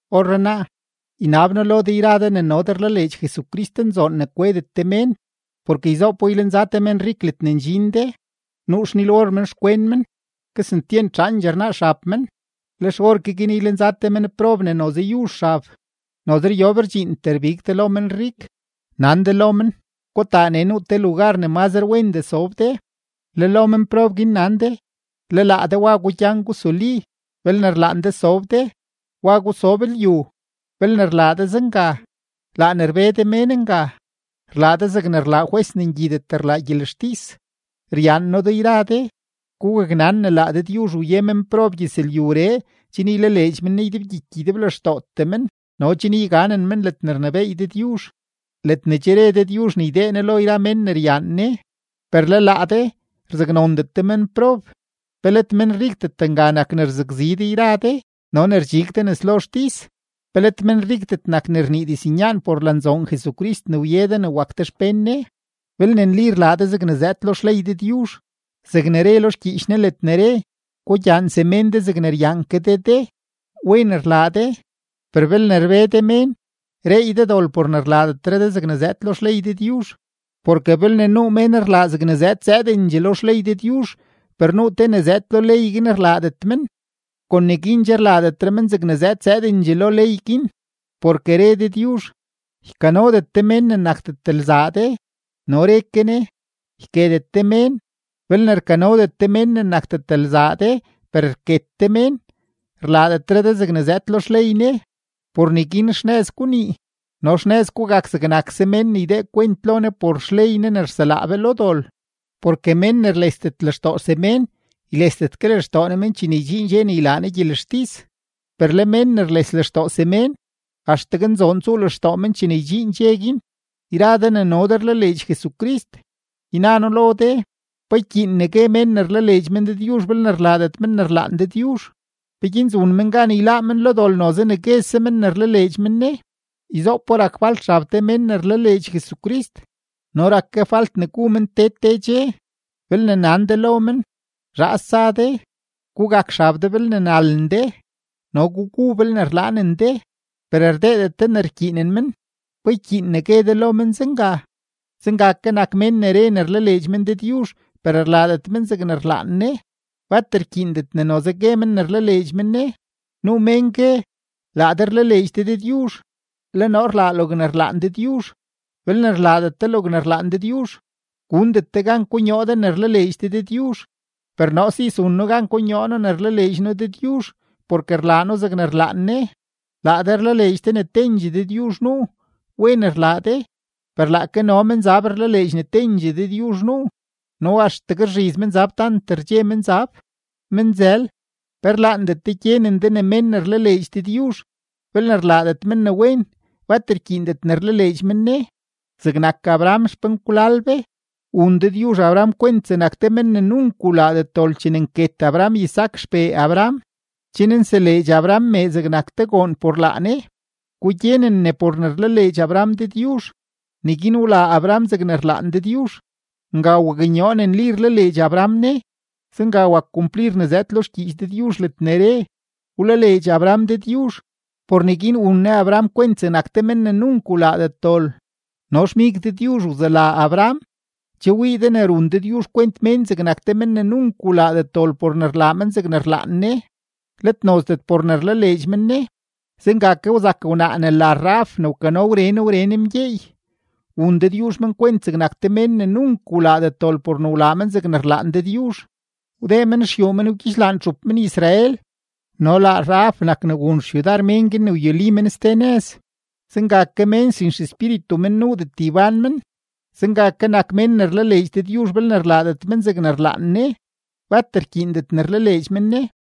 Orrenaa, ynab noo lo de yra de ne no de rlaleedx Jesucristnzoon, ne kwedet de mén. Porke yzoopo ylenza te menrik ledne ndxin de, nuu xnil-or men xkwen men, kesentyent zhaandxee rnaa xab men, lex orke guin ylenza te menprob ne noze yuzh xab. Noze ryob rdxiintee rbig de lo menrik, nan de lo men: “Gutaa nee nuu te lugar ne mazre wendee sob de.” Le lo menprob guin nan de: “Le laa de wa gugyan gusuli; belne rlaan de sob de, wa gusob lyu.” Belne rlaa de zenga, laa ne rbe de mén nga, rlaa de zeg rlaa jwes ne ngyidet rlaa gyelextis. Ryaan noo de yra de. Gugaknan ne laa Dëdyuzh wye menprob gyëzlyuree chen ylaleedx men Ne ydebgyiky ydeblextootee men no chen yganen men ledne rnebééy Dëdyuzh, ledne che re Dëdyuzh ne ydee Ne lo yra mén ne ryaan Ne. Per le laa de, rzaknondet de menprob. ¿Pe let menrikdet nga nak ne rzakzi de yra de no ne rdxig de nes lo xtis? ¿Pe let menrikdet nak ne rnii diznyaan por lanzoon Jesucrist ne wye de ne wak de xpén Ne? Belne nli rlaa de zegne zëëd lo xley Dëdyuzh, zegne re lo xgyiich Ne ledne re: “Gugyaan semén de zegne ryaan ke de de”, wen rlaa de. Per belne rbe de mén, reey de dol por ne rlaadetre de zegne zëëd lo xley Dëdyuzh. Porke belne nuu mén ne rlaa yrandxee ne zëëd lo xley Dëdyuzh per nuu te ne zëëd lo ley guin rlaadet men, kon neguin che rlaadetre men zegne zëëd zëëdendxee lo ley guin. Porke re Dëdyuzh: “Ykanodet de mén ne nakdet lzaa de”, no re ke Ne: “Yketet de mén.” Belne rkanodet de mén ne nakdet lzaa de per rket de mén, rlaadetre de zegne zëëd lo xley Ne. Por neguin xnëz gunii no xnëz gugak zegnakse mén ne ydee kwent lo Ne por xley Ne ne rselaa be lo dol. Porke mén ne rlesdet lextoo semén, ylesdet ke lextoo Ne men chene ydxiin dxe ne ylaa Ne gyelextis; per le mén ne rles lextoo semén, axtegue nzoon tsuu lextoo men chene ydxiin dxe guin. Yra de ne no de rlaleedx Jesucrist, yna noo lo de, ¿pa ykyiin ne gue mén ne rlaleedx men Dëdyuzh belne rlaadet men ne rlaan Dëdyuzh? ¿Peguin zun men gan yláá men lo dol noze ne guese men ne rlaleedx men Ne? Yzoopo rak falt xab te mén ne rlaleedx Jesucrist no rak ke falt ne gu men te te dxe; belne nan de lo men: “Zhaas tsa de, gugak xab de belne nalen de, no gugu belne rlaanen de”, per rdeedet de ne rkyiinen men, ¿pa ykyiin ne gue de lo men zenga? Zenga ke nak mén ne re ne rlaleedx men Dëdyuzh per rlaadet men zegne rlaan Ne, bat rkyiindet ne noze gue men ne rlaleedx men Ne. Nuu mén gue: “Laa de rlaleedx de Dëdyuzh, le noo rlaa logne rlaan Dëdyuzh.” Belne rlaadet de logne rlaan Dëdyuzh, gundet de gan konyoo de ne rlaleedx de Dëdyuzh; per noo si zun noo gan konyoo noo ne rlaleedx noo Dëdyuzh, porke rlaa noo zegne rlaan Ne. Laa de rlaleedx de ne tendxee Dëdyuzh nuu. Wen rlaa de, per laake no menzab rlaleedx ne tendxee Dëdyuzh nuu, no axtegue rzhiz menzab tant rdxe menzab. Menzël, ¿pe rlaandet de gyenen de ne mén ne rlaleedx Dëdyuzh, belne rlaadet men ne wen, bat rkyiindet ne rlaleedx men Ne? Zegnak Abraham xpenkwlal be, wun Dëdyuzh Abraham kwent zegnak te men ne nunk wlaadet dol chene nket Abraham Isaac xpee Abraham, chen nseleedx Abraham me zegnak te goon por laa Ne. Gugyenen ne por ne rlaleedx Abraham Dëdyuzh, neguin wlaa Abraham zegne rlaan Dëdyuzh; nga waknyoo ne nli rlaleedx Abraham Ne. Zenga wak kumplir ne zëëd lo xgyiich Dëdyuzh ledne re: “Wlaleedx Abraham Dëdyuzh; por neguin wun Ne Abraham kwent zegnak te men ne nunk wlaadet dol.” No xmig Dëdyuzh wzela Abraham. Che wii de ne run Dëdyuzh kwent mén zegnak te mén ne nunk wlaadet dol por ne rlaa men zegne rlaan Ne, let nozdet por ne rlaleedx men Ne. Zenga ke wzak wnaa ne la Rahab ne wkano wren wren mgyeey; wun Dëdyuzh men kwent zegnak te mén ne nunk wlaadet dol por ne wlaa men zegne rlaan Dëdyuzh, wdee men ruxyuu men wgyidxlaan txup men-Israel no laa Rahab nak ne wun xyudar mén guin ne wyuli men ste nëz. Zenga ke mén sin xespíritu men nuudet ybán men, zenga ke nak mén ne rlaleedx Dëdyuzh belne rlaadet men zegne rlaan Ne, bat rkyiindet ne rlaleedx men Ne.